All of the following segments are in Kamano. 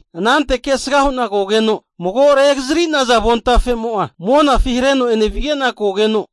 Anante kesga hu'na kogeno mago regazari'naza avontafemo'a monafi hareno enevige'na kogeno,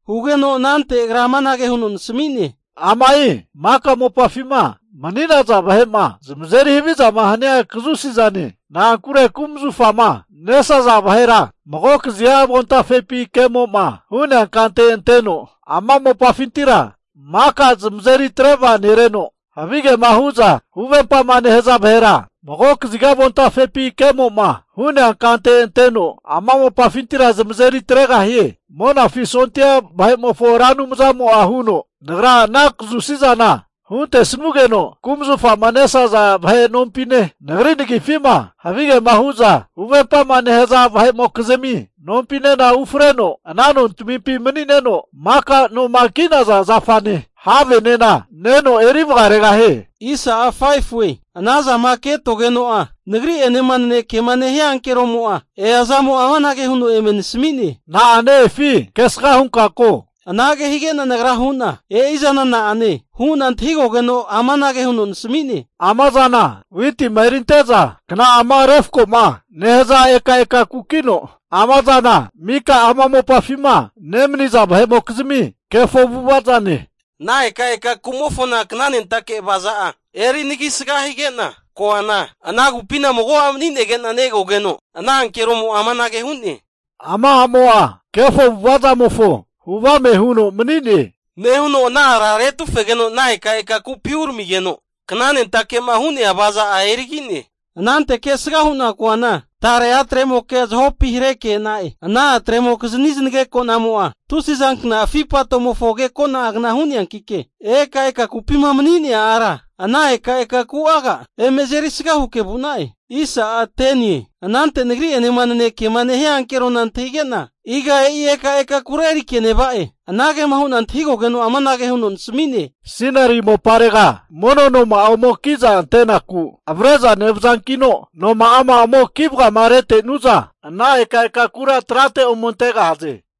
Hugeno anante agra amanage huno nasami'ne, Ama'i maka mopafima mani'naza vahe'ma zamazeri havizama hania kazusi zane. Na'ankure kumzufama nesaza vahera mago kaziga avontafepi kemo'ma hu'nea kante anteno, ama mopafintira maka zamazeri atre vaganereno, havigema hu'za huvempama nehaza vahera mago kaziga avontafepi kemo'ma hu'nea kante anteno, ama mopafintira zamazeri atregahie. Monafi sondia vahe'mofo Ra Anumzamo'a huno, Nagra ana kazusizana huntesugeno kumazufama nesaza vahe nompine, nagri nagifima havigema hu'za huvempama nehaza vahe'mokizmi nompinena ufreno, ana nontamimpi mani'neno, maka noma ki'naza zafane havenena neno eri vagaregahie. Ana zama ketogeno'a nagri'enema nanekema nehia ankeromo'a eazamo amanage huno eme nasami'ne, Na'a ne-efi kesga hunka ko. Anage hige'na nagra hu'na, e'i zana na'ane? Hu'na antahigogeno amanage huno nasami'ne, ama zana witima erinte'za kna'ama refkoma nehaza ekaeka kukino, (ephah) ama zana mika ama mopafima nemaniza vahe'mokizmi kefo avu'avazane. Ana ekaeka ku'mofona knanentake avaza'a eri anagisga higena koana, ana kupina mago a' mani'negena negogeno, ana ankeromo'a amanage hu'ne, Ama a'mo'a kefo avu'avazamofo hu avame huno mani'ne, nehuno ana ara retufegeno ana ekaeka kupi uramigeno knanentake'ma hu'nea avaza'a erigi'ne. Anante kesga hu'na koana, tare a'tremokea zahopi hareke e'na'e. Ana a'tremokizni zanagekonamo'a tusizankna afi patomofo agekona'agna hu'neankike, ekaeka kupima mani'nea ara, ana ekaeka ku'aga eme azerisga huke vu'na'e. Anante nagri'enema nanekema nehia ankerona antahige'na, iga e'i ekaeka kura erike neva'e? Anagema hu'na antahigogeno'a amanage huno nasami'ne, Sinari moparega mono noma'a ome ki'za ante'naku avre'za nevazankino, noma'ama ome ki vagama retenu'za, ana ekaeka kura trate ome antegahaze.